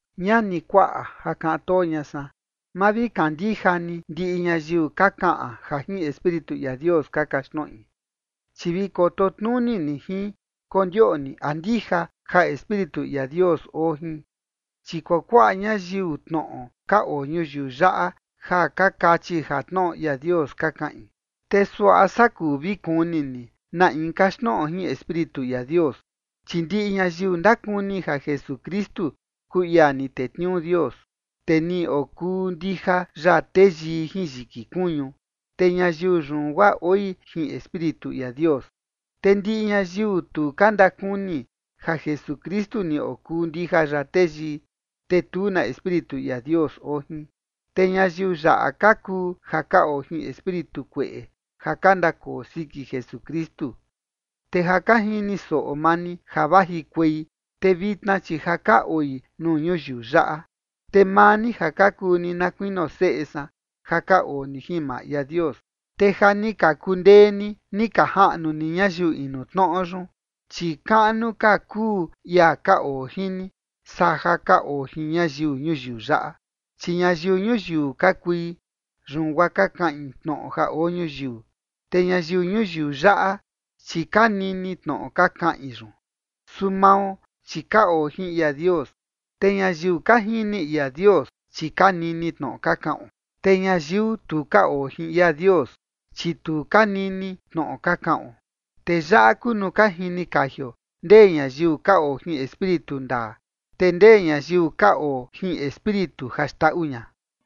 Ñani kuaꞌa, ja kaꞌan too ña san, ma vi kandija ni ndiꞌi ñayiu ka kaꞌan ja jin Espíritu ia Dios ka kaxtnoꞌi, chi vi koto tnuni ni jin kondioꞌni a ndija ja Espíritu ia Dios oo jin. Chi kuakuaꞌa ñayiu tnoꞌo ka oo ñuyiu yaꞌa ja ka kachi ja tnoꞌo ia Dios ka kaꞌin. Te suaꞌa saa kuu vi kuni ni na in kaxtnoꞌo jin Espíritu ia Dios, chi ndiꞌi ñayiu ndakuni ja Jesukristu kuu ia ni tetniuu Dios, te ni okuu ndija ya teyii jin yiki kuñu, te ñayiu yun guaa oi jin Espíritu ia Dios. Te ndiꞌi ñayiu tu ka ndakuni ja Jesukristu ni okuu ndija ya teyii, te tu na Espíritu ia Dios oo jin, te ñayiu yaꞌa ka kuu ja ka oo jin espíritu kueꞌe ja ka ndakoo siki Jesukristu. Te ja ka jini soꞌo maa ni ja vajikuei, te vitna, chi ja ka oi nuu ñuyiu yaꞌa. Te maa ni ja ka kuu ni na kuinio seꞌe san, ja ka oo ni jin maa ia Dios, te ja ni ka kundee ni, ni ka jaꞌnu ni ñayiu inu tnoꞌo yun, chi kaꞌnu ka kuu ia ka oo jin ni, saa ja ka oo jin ñayiu ñuyiu yaꞌa. Chi ñayiu ñuyiu ka kui, yun guaa ka kaꞌin tnoꞌo ja oo ñuyiu, te ñayiu ñuyiu yaꞌa, chi ka nini tnoꞌo ka kaꞌin yun. Su mao, chi ka oo jin ia Dios, te ñayiu ka jini ia Dios, chi ka nini tnoꞌo ka kaꞌon. Te ñayiu tu ka oo jin ia Dios, chi tu ka nini tnoꞌo ka kaꞌon. Te yaꞌa kuu nuu ka jini kajio ndee ñayiu ka oo jin Espíritu ndaa, te ndee ñayiu ka oo jin espíritu ja xndaꞌu ña.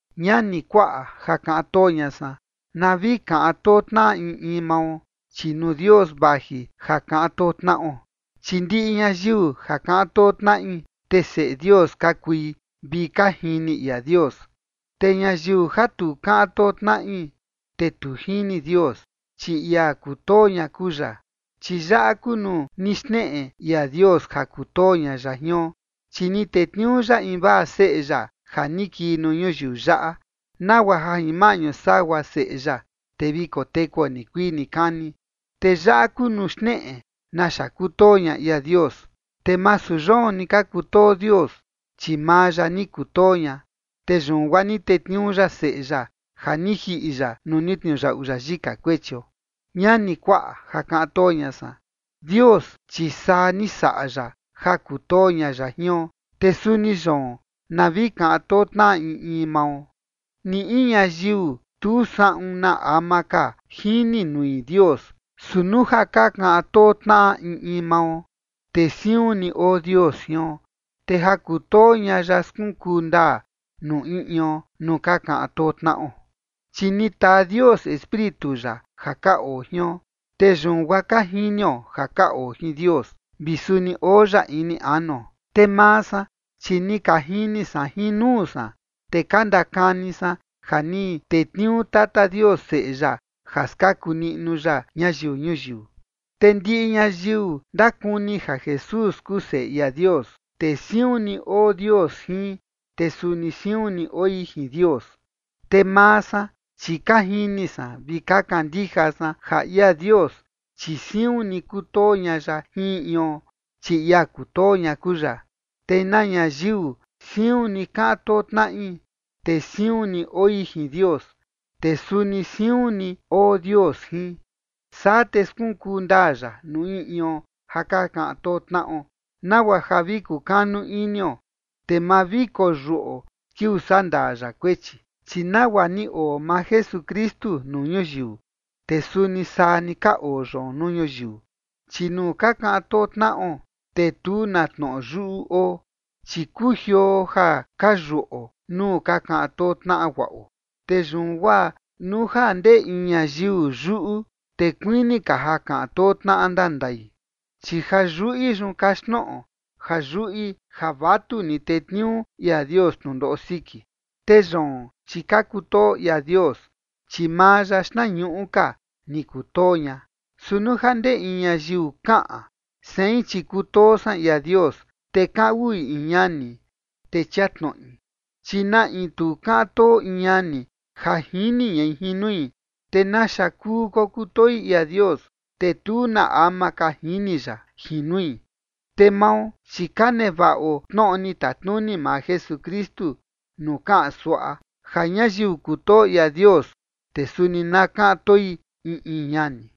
Ñani kuaꞌa ja kaꞌan too ña san, na vi kaꞌan too tnaꞌa in in mao, chi nuu Dios vaji ja kaꞌan too tnaꞌo. Chi ndiꞌi ñayiu ja kaꞌan too tnaꞌi, te seꞌe Dios ka kui vi ka jini ia Dios. Te ñayiu ja tu kaꞌan too tnaꞌi, te tu jini Dios, chi ia kutoo ña kuu ya. Chi yaꞌa kuu nuu ni xneꞌe ia Dios ja kutoo ña ya jion, chi ni tetniuu ya invaa Seꞌe ya ja ni kii nuu ñuyiu yaꞌa, nagua ja jin maꞌñu sagua Seꞌe ya, te vi kotekuo nikuii nikani. Te yaꞌa kuu nuu xneꞌe naxa kutoo ña ia Dios, te masu yoon ni ka kutoo Dios, chi maa ya ni kutoo ña, te yun guaa ni tetniuu ya Seꞌe ya, ja ni jiꞌi ya nuu ni tniuyaꞌu ya yika kuechio. Ñani kuaꞌa ja kaꞌan too ña san, Dios chi saa ni saꞌa ya ja kutoo ña ya jion, te suni yoon na vi kaꞌan too tnaꞌa in in mao. Ni in ñayiu tu saꞌun na ama ka jini nui Dios, su nuu ja ka kaꞌan too tnaꞌa in in mao, te siun ni oo Dios jion, te ja kutoo ña ya skunkuu ndaa nuu in ion nuu ka kaꞌan too tnaꞌo. Chi ni taa Dios Espíritu ya ja ka oo jion, te yun guaa ka jinio ja ka oo jin Dios, vi suni oo ya ini anuo. Te maa san, chi ni ka jini san jin nuu san, te ka ndakani san ja ni tetniuu tata Dios Seꞌe ya ja skaku niꞌnu ya ñayiu ñuyiu. Te ndiꞌi ñayiu ndakuni ja Jesús kuu Seꞌe ia Dios, te siun ni oo Dios jin, te suni siun ni oi jin Dios. Te maa san, chi ka jini san vi ka kandija san ja ia Dios, chi siun ni kutoo ña ya jin in ion, chi ia kutoo ña kuu ya, te na ñayiu siun ni kaꞌan too tnaꞌi, te siun ni oi jin Dios, te suni siun ni oo Dios jin. Saa te skunkuu ndaa ya nuu in ion ja ka kaꞌan too tnaꞌo, nagua ja vi kukanu inio, te ma vi koyuꞌo kiuu sandaa ya kuechi, chi nagua ni oo maa Jesukristu nuu ñuyiu, te suni saa ni ka oo yoon nuu ñuyiu. Chi nuu ka kaꞌan too tnaꞌo, te tu na tnoꞌo yuꞌu oo, chi kujioo ja ka yuꞌo nuu ka kaꞌan too tnaꞌa guaꞌo. Te yun guaa nuu ja ndee in ñayiu yuꞌu, te kuini ka ja kaꞌan too tnaꞌa ndandai, chi ja yuꞌi yun kaxtnoꞌo ja yuꞌi ja vatuni tetniuu ia Dios tnundoꞌo siki. Te yoon, chi ka kutoo ia Dios, chi maa ya xtnañuꞌu ka, ni kutoo ña. Su nuu ja ndee in ñayiu kaꞌan: “Sein, chi kutoo san ia Dios”, te kaꞌan uꞌui in ñani, te chia tnoꞌi. Chi na in tu kaꞌan too in ñani ja jini ñai jin nui, ¿te naxa kuu kokutoi ia Dios, te tu na ama ka jini ya jin nui? Te mao, chi ka nevaꞌo tnoꞌo ni tatnuni maa Jesukristu nuu kaꞌan suaꞌa, ja ñayiu kutoo ia Dios, te suni na kaꞌan toi in in ñani.